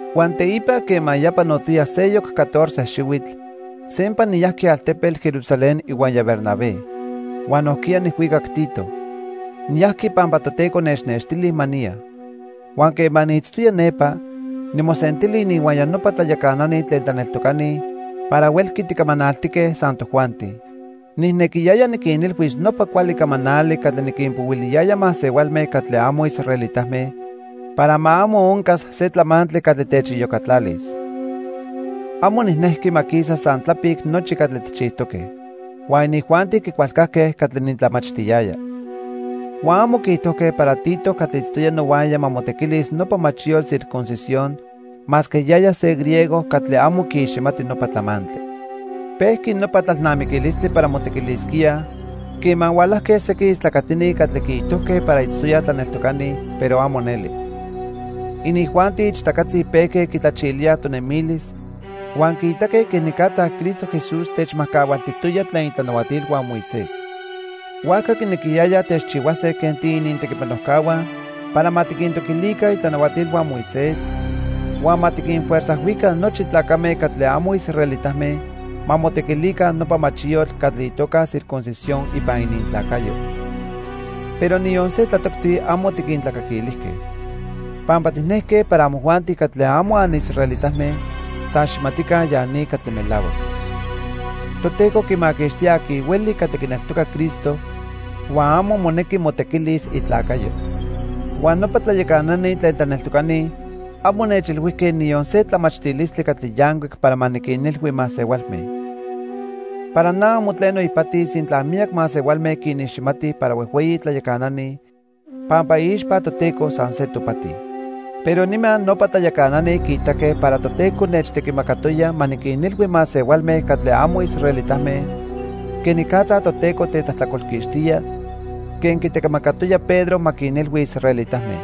Huan teipa quema ya panotoya seyoc catorce xihuitl, sempa niyajqui altepetl Jerusalén ihuaya Bernabé. Huan nojquiya nijhuicac Tito. Niyajqui pampa Toteco nechnextili ma niya. Huan quema niitztoya nepa, nimosentili ininhuaya nopa tlayacanani tlen tlaneltocani para huelqui ticamanaltique san tojuanti. Nijnequiyaya niquinilhuis nopa cuali camanali catli niquinpohuiliyaya masehualme catli amo israelitame para ma amo oncas se tlamantli catli techiyocatlalis. Amo nijnejqui ma quisa san tlapic nochi catli tijchijtoque. Huan inijuanti quicualcajque catli nitlamachtiyaya. Huan amo quiijtojque para Tito catli itztoya nohuaya ma motequilis nopa machiyotl circuncisión, masque yaya se griego catli amo quiiximati nopa tlamantli. Pejqui nopa tlalnamiquilistli para motequilisquíaj quema hualajque sequin istlacatini catli quiijtojque para itztoyaj tlaneltocani, pero amo neli. Inijuanti ichtacatzi pejque quitlachilíaj tonemilis huan quiitaque quenicatza Cristo Jesús techmajcahualtijtoya tlen itlanahuatilhua Moisés. Huajca quinequiyayaj techchihuase quen tiinintequipanojcahua para ma tiquintoquilica itlanahuatilhua Moisés huan ma tiquinfuerzajhuica nochi tlacame catli amo israelitame ma motequilica nopa machiyotl catli itoca circuncisión ipan inintlacayo. Pero niyon se tlatoctzi amo tiquintlacaquilijque. Pampa tijnejque para amojuanti catli amo anisraelitame san xijmatica ya ni catli melahuac. Toteco quimaquixtía aqui hueli catli quineltoca Cristo, huan amo monequi motequilis itlacayo. Huan nopa tlayacanani tlen tlaneltocani amo nechilhuijque niyon se tlamachtilistli catli yancuic para ma niquinilhui masehualme. (Para na amo tleno ipati sintla miyac masehualme quiniximatij para huejhueyi tlayacanani, pampa iixpa Toteco san se topati.) Pero nima nopa tlayacanani quiitaque para Toteco nechtequimacatoya ma niquinilhui masehualme catli amo israelitame quenicatza Toteco tetlajtlacolquixtía, quen quitequimacatoya Pedro ma quinilhui israelitame.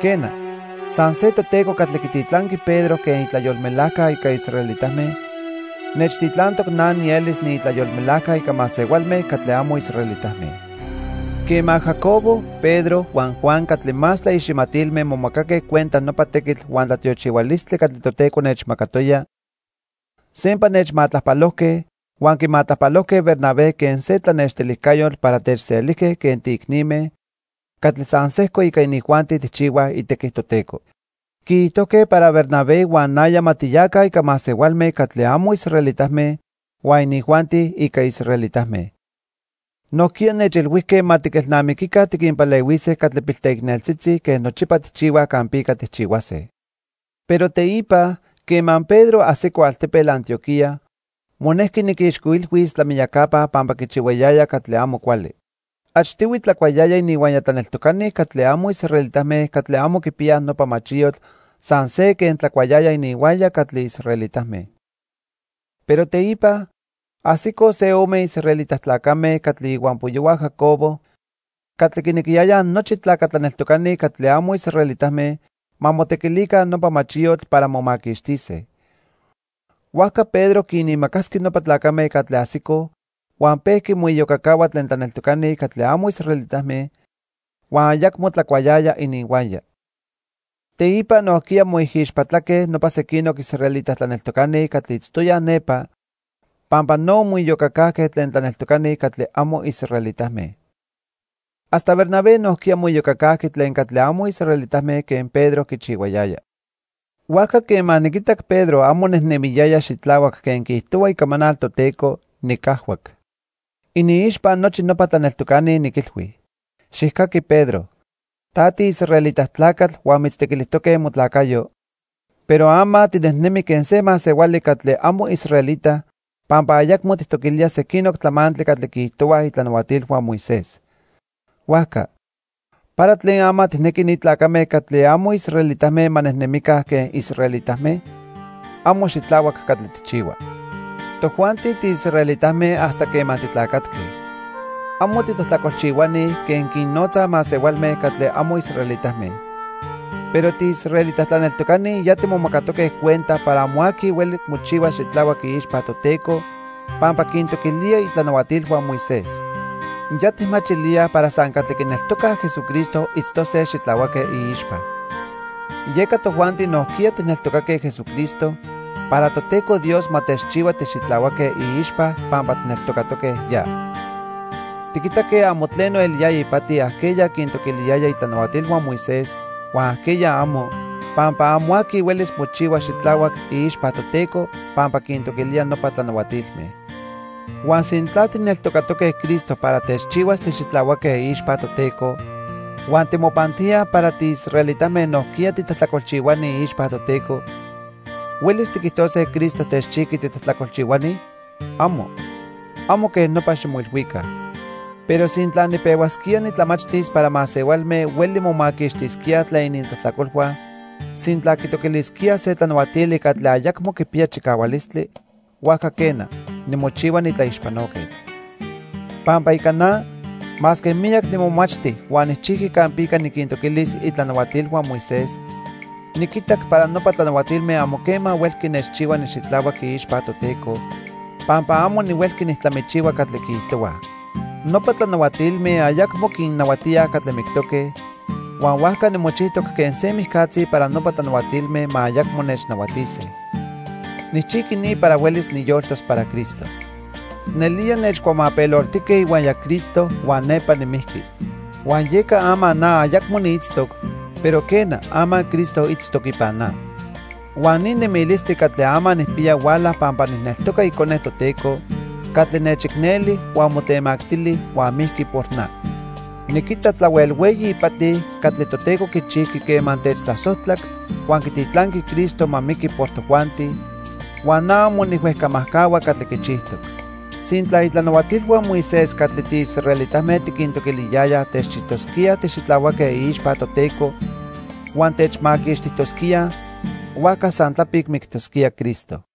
Quena, san se Toteco catli quititlanqui Pedro quen itlayolmelajca ica israelitame, nechtitlantoc na nielis niitlayolmelajca ica masehualme catli amo israelitame. Quema Jacobo, Pedro huan Juan catli más tlaiximatilme momacaque cuenta nopa tequitl huan tlatiochihualistli catli Toteco nechmacatoya, sempa nechmatlajpalojque huan quimatlajpalojque Bernabé quen se tlanextilijcayotl para techselijque quen tiicnime catli san sejco ica inijuanti tijchihuaj itequi Toteco. Quiijtojque para Bernabé huan naya ma tiyaca ica masehualme catli amo israelitame huan inijuanti ica israelitame. Nojquiya nechilhuijque ma tiquelnamiquica tiquinpalehuise catli pilteicneltzitzi quen nochipa tijchihuaj campica tijchihuase. Pero teipa, quema Pedro ajsico altepetl Antioquía, monejqui niquixcoilhuis tlamiyacapa pampa quichihuayaya catli amo cuali. Achtihui tlacuayaya ininhuaya tlaneltocani catli amo israelitame catli amo quipiyaj nopa machiyotl san se quen tlacuayaya ininhuaya catli israelitame. Pero teipa, ajsicoj se ome israelita tlacame catli ihuampoyohua Jacobo catli quinequiyayaj nochi tlaca tlaneltocani catli amo israelitame ma motequilica nopa machiyotl para momaquixtise. Huajca Pedro quinimacasqui nopa tlacame catli ajsicoj huan pejqui moiyocacahua tlen tlaneltocani catli amo israelitame, huan ayacmo tlacuayaya ininhuaya. Teipa nojquiya moijixpatlaque nopa sequinoc israelita tlaneltocani catli itztoyaj nepa pampa no moiyocacajque tlen tlaneltocani catli amo israelitame. Hasta Bernabé nojquiya moiyocacajqui tlen catli amo israelitame quen Pedro quichihuayaya. Huajca quema niquitac Pedro amo nejnemiyaya xitlahuac quen quiijtohua icamanal Toteco, nicajhuac. Iniixpa nochi nopa tlaneltocani, niquilhui: "Xijcaqui Pedro, ta tiisraelita tlacatl huan mitztequilijtoque motlacayo, pero ama tinejnemi quen se masehuali catli amo israelita pampa ayacmo tijtoquilía sequinoc tlamantli catli quiijtohuaj itlanahuatilhua Moisés. Huajca, ¿para tlen ama tijnequi ni tlacame catli amo israelitame ma nejnemica quen israelitame? Amo xitlahuac catli tijchihua." Tojuanti tiisraelitame hasta quema titlacatque. Amo "titlajtlacolchihuani" quen quinnotzaj masehualme catli amo israelitame. Pero tiisraelita tlaneltocani ya timomacatoque cuenta para amo aqui hueli mochihuas xitlahuac iixpa Toteco pampa quintoquilía itlanahuatilhua Moisés. Ya tijmachilíaj para san catli quineltoca Jesucristo itztose xitlahuaque iixpa. Yeca tojuanti nojquiya tijneltocaque Jesucristo para Toteco Dios ma techchihua tixitlahuaque iixpa pampa tijneltocatoque ya. Tiquitaque amo tleno eliyaya ipati ajqueya quintoquiliyaya itlanahuatilhua Moisés huan ajqueya amo, pampa amo aqui huelis mochihuas xitlahuac iixpa Toteco pampa quintoquilía nopa tlanahuatilme. Huan sintla tijneltocatoque Cristo para techchihuas tixitlahuaque iixpa Toteco, huan timopantíaj para tiisraelitame nojquiya titlajtlacolchihuani iixpa Toteco, ¿huelis tiquijtose Cristo techchijqui titlajtlacolchihuani? ¡Amo! Amo quej nopa ximoilhuica. Pero sintla nipehuasquía nitlamachtis para masehualme hueli momaquixtisquíaj tlen inintlajtlacolhua sintla quitoquilisquíaj se tlanahuatili catli ayacmo quipiya chicahualistli, huajca quena, nimochihua nitlaixpanoquetl. Pampa ica na, masque miyac nimomachti huan nijchijqui campica niquintoquilis itlanahuatilhua Moisés, niquitac para nopa tlanahuatilme amo quema huelqui nechchihua nixitlahuac iixpa Toteco, pampa amo nihuelqui nijtlamichihua catli quiijtohuaj. Nopa tlanahuatilme ayacmo quinnahuatíaj catli mictoque, huan huajca nimochijtoc quen se nimijcatzi para nopa tlanahuatilme ma ayacmo nechnahuatise. Nijchijqui ni para huelis niyoltos para Cristo. Nelía nechcuamapeloltijque ihuaya Cristo huan nepa nimijqui. Huan yeca ama na ayacmo niitztoc, pero quena, ama Cristo itztoc ipan na. Huan ni nemilistli catli ama nijpiya huala pampa nijneltoca Icone Toteco catli nechicneli huan motemactili huan mijqui por na. Niquita tlahuel hueyi ipati catli Toteco quichijqui quema techtlasojtlac huan quititlanqui Cristo ma miqui por tojuanti, huan na amo nijhuejcamajcahua catli quichijtoc. Sintla itlanahuatilhua Moisés catli tiisraelitame tiquintoquiliyayaj techchijtosquíaj tixitlahuaque iixpa Toteco huan techmaquixtijtosquíaj, huajca san tlapic mictosquía Cristo.